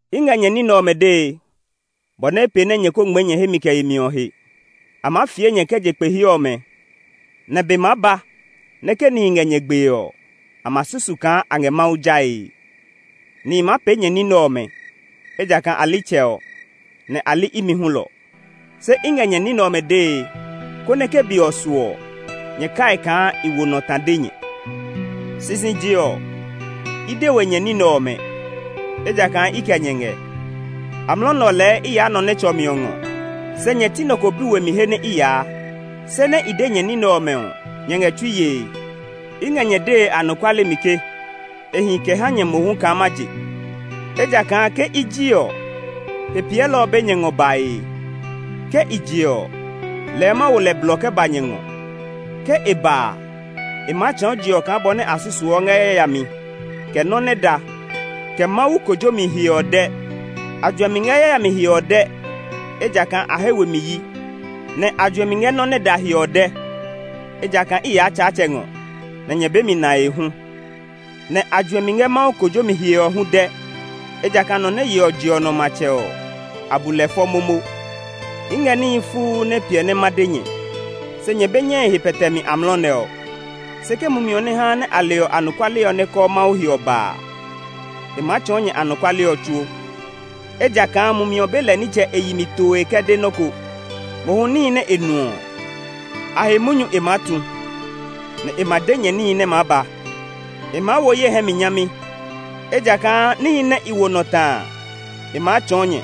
“I ngɛ nyɛ ní nɛ ɔmɛ dee, bɔ nɛ pee nɛ nyɛ ko ngmɛɛ nyɛ hemi kɛ yemi ɔ he. A maa fie nyɛ kɛ je kpe he ɔmɛ, nɛ be maa ba nɛ ke nihi ngɛ nyɛ gbee ɔ, a ma susu kaa Mawu lɛ a ngɛ jae. Nihi maa pee nyɛ ní nɛ ɔmɛ, ejakaa a li Tsɛ ɔ; nɛ a li imi hulɔ. Se i ngɛ nyɛ ní nɛ ɔmɛ dee, konɛ ke be ɔ su ɔ, nyɛ kai kaa i wo nɔ ta de nyɛ. Bɔ nɛ Mumi Klɔuklɔu ɔ tsuɔ ní “Sisije ɔ, i de we nyɛ ní nɛ ɔmɛ, ejakaa i kɛ nyɛ ngɛ. Amlɔ nɛ ɔ lɛɛ i yaa nɔ nɛ tsɔ mi ɔ ngɔ, se nyɛ ti nɔ ko bi we mi he nɛ i yaa. Se nɛ i de nyɛ ní nɛ ɔmɛ ɔ, nyɛ ngɛ tsui yee. I ngɛ nyɛ dee anɔkuale mi ke e hi kɛ ha nyɛ mohu kaa ma je, ejakaa ke i ji ɔ, Hepiɛlɔ ɔ be nyɛ ngɔ bae. Ke i je ɔ lɛɛ ma wo lɛ blɔ kɛ ba nyɛ ngɔ. Ke e ba a, e maa tsɔɔ je ɔ kaa bɔ nɛ a susuɔ ngɛ yayami, kɛ nɔ́ nɛ da, kɛ Mawu kojomi he ɔ dɛ. A juɛmi ngɛ yayami he ɔ dɛ, ejakaa a he we mi yi; nɛ a juɛmi ngɛ nɔ́ nɛ da he ɔ dɛ, ejakaa i yaa Tsaatsɛ ngɔ nɛ nyɛ be mi nae hu. Nɛ a juɛmi ngɛ Mawu kojomi he ɔ hu dɛ, ejakaa nɔ nɛ yeɔ je ɔ nɔ matsɛ ɔ, a bu lɛ fɔ momo. “I ngɛ níhi fuu nɛ piɛ nɛ ma de nyɛ, se nyɛ be nyɛe he maa pɛtɛ amlɔ nɛ ɔ. Se ke Mumi ɔ nɛ haa a leɔ anɔkuale ɔ nɛ kɔɔ Mawu he ɔ ba a, e maa tsɔɔ nyɛ anɔkuale ɔ tsuo. Ejakaa Mumi ɔ be lɛ nitsɛ e yi mi toe kɛ de nɔ́ ko; mohu níhi nɛ e nu ɔ, a he munyu e maa tu; nɛ e ma de nyɛ níhi nɛ maa ba. E maa wo ye hɛ mi nyami, ejakaa níhi nɛ i wo nɔ ta a, e maa tsɔɔ nyɛ.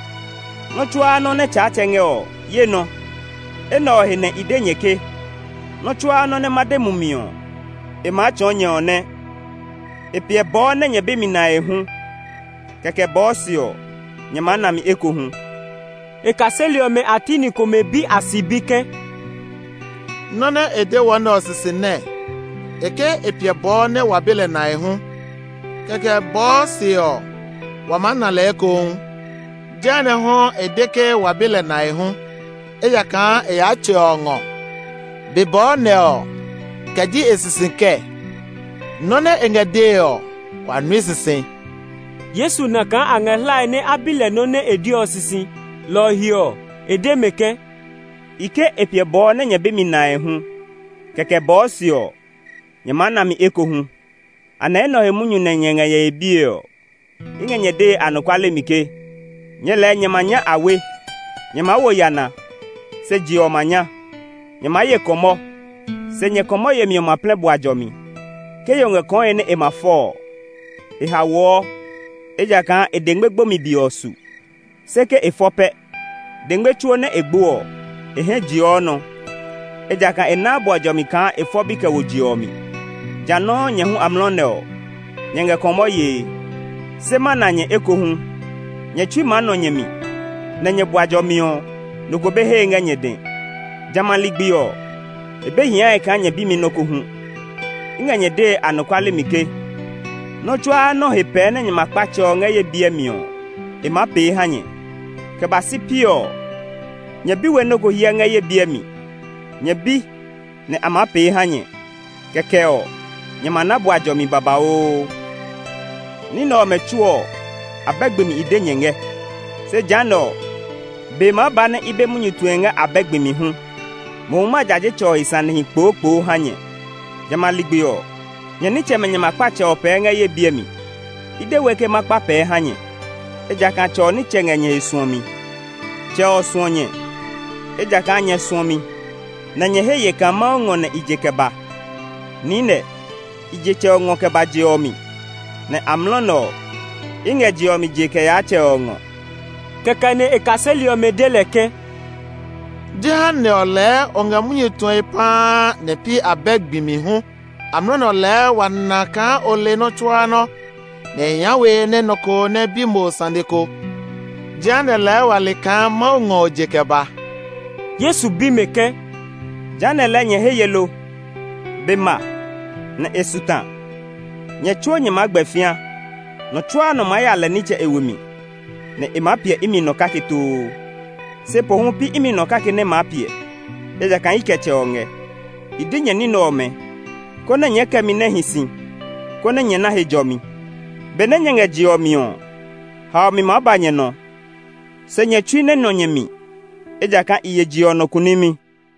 Nɔ́ tsuaa nɔ́ nɛ Tsaatsɛ ngɛ ɔ, ye nɔ. Enɛ ɔ he nɛ i de nyɛ ke, nɔ́ tsuaa nɔ́ nɛ ma de Mumi ɔ, e maa tsɔɔ nyɛ ɔ nɛ. “E piɛ bɔɔ nɛ nyɛ be mi nae hu; kɛkɛ ɔ, bɔɔ se ɔ, nyɛ maa na mi ekohu.” E kaseli ɔmɛ a ti ni komɛ bi a sibi ke, “Nɔ nɛ e de wɔ nɛ ɔ sisi nɛɛ? E ke e piɛ bɔɔ nɛ wa be lɛ nae hu; kɛkɛ ɔ, bɔɔ se ɔ, wa maa na lɛ ekohu. Jehanɛ hu e de ke wa be lɛ nae hu, ejakaa e yaa Tsɛ ɔ ngɔ. ‘Be bɔɔ’ nɛ ɔ, kɛ ji e sisi kɛɛ? Nɔ́ nɛ e ngɛ dee ɔ, wa nui sisi!” Yesu na kaa a ngɛ hlae nɛ a bi lɛ nɔ́ nɛ e de ɔ sisi, lɔ ɔ he ɔ, e de mɛ ke, “I ke, ‘E piɛ bɔɔ nɛ nyɛ be mi nae hu; kɛkɛ bɔɔ se ɔ, nyɛ maa na mi ekohu.’ Anɛ enɛ ɔ he munyu nyɛ ngɛ nyɛ he bie ɔ? I ngɛ nyɛ dee anɔkuale mi ke, nyɛɛ lɛɛ nyɛ ma kpa ngmlaa; nyɛ maa wo yana, se je ɔ ma nya. Nyɛ maa ye kɔmɔ, se nyɛ kɔmɔ yemi ɔ ma plɛ bua jɔmi. Ke yo ngɛ kɔe nɛ e ma fɔ ɔ, e haoɔ, ejakaa e dengme gbomi be ɔ su; se ke e fɔ pɛ, dengme tsuo nɛ e gbo ɔ, e hɛ jeɔ nɔ; ejakaa e naa bua jɔmi kaa e fɔ bi kɛ wo je ɔ mi. Jã nɔuu, nyɛ hu amlɔ nɛ ɔ, nyɛ ngɛ kɔmɔ yee, se ma na nyɛ ekohu. Nyɛ tsui maa nɔ nyɛ mi, nɛ nyɛ bua jɔmi ɔ, nɔ ko be hee ngɛ nyɛ dɛ. “Jamɛ a ligbi ɔ, e be hiae kaa nyɛ bi mi nɔ́ ko hu. I ngɛ nyɛ dee anɔkuale mi ke, nɔ́ tsuaa nɔ́ he pɛɛ nɛ nyɛ ma kpa Tsɛ ɔ ngɛ ye biɛ mi ɔ, e maa pee ha nyɛ. Kɛ ba si piɔ ɔ, nyɛ bi we nɔ́ ko hyɛ ngɛ ye biɛ mi. Nyɛ bi, nɛ a maa pee ha nyɛ; kɛkɛ ɔ, nyɛ ma na bua jɔmi babauu. “Ní nɛ ɔmɛ tsuo ɔ, abɛ gbi mi i de nyɛ ngɛ. Se jehanɛ ɔ, be maa ba nɛ i be munyu tue ngɛ abɛ gbi mi hu. Mohu ma jaje Tsɛ ɔ he sanehi kpookpoo ha nyɛ. Jamɛ a ligbi ɔ, nyɛ nitsɛmɛ nyɛ ma kpa Tsɛ ɔ pɛɛ ngɛ ye biɛ mi. I de we ke ma kpa pɛɛ ha nyɛ, ejakaa Tsɛ ɔ nitsɛ ngɛ nyɛ he suɔmi. Tsɛ ɔ suɔ nyɛ, ejakaa nyɛ suɔ mi, nɛ nyɛ he ye kaa Mawu ngɔ nɛ i je kɛ ba. Niinɛ, i je Tsɛ ɔ ngɔ kɛ ba je ɔ mi, nɛ amlɔ nɛ ɔ, i ngɛ je ɔ mi jee kɛ yaa Tsɛ ɔ ngɔ.” Kɛkɛ nɛ e kaseli ɔmɛ de lɛ ke, “Jehanɛ ɔ lɛɛ o ngɛ munyu tue paa nɛ pi abɛ gbi mi hu. Amlɔ nɛ ɔ lɛɛ wa na kaa o le nɔ́ tsuaa nɔ́, nɛ e hia we nɛ nɔ ko nɛ bi mo sane ko. Jehanɛ lɛɛ wa he ye kaa Mawu ngɔ nɛ o je kɛ ba.” Yesu bi mɛ ke, “Jehanɛ lɛɛ nyɛ he ye lo? Be ma, nɛ e su ta; nyɛ tsuo nyɛ maa gbɛ fĩa. Nɔ tsuaa nɔ maa ya lɛ nitsɛ e we mi, nɛ e maa piɛ imi nɔ kake too. Se pohu pi imi nɔ kake nɛ maa piɛ, ejakaa i kɛ Tsɛ ɔ ngɛ. I de nyɛ ní nɛ ɔmɛ, konɛ nyɛɛ kɛ mi nɛ hi si, konɛ nyɛ na he jɔmi. Benɛ nyɛ ngɛ je ɔ mi ɔ, haomi maa ba nyɛ nɔ; se nyɛ tsui nɛ nɔ nyɛ mi, ejakaa i ye je ɔ nɔ kunimi.”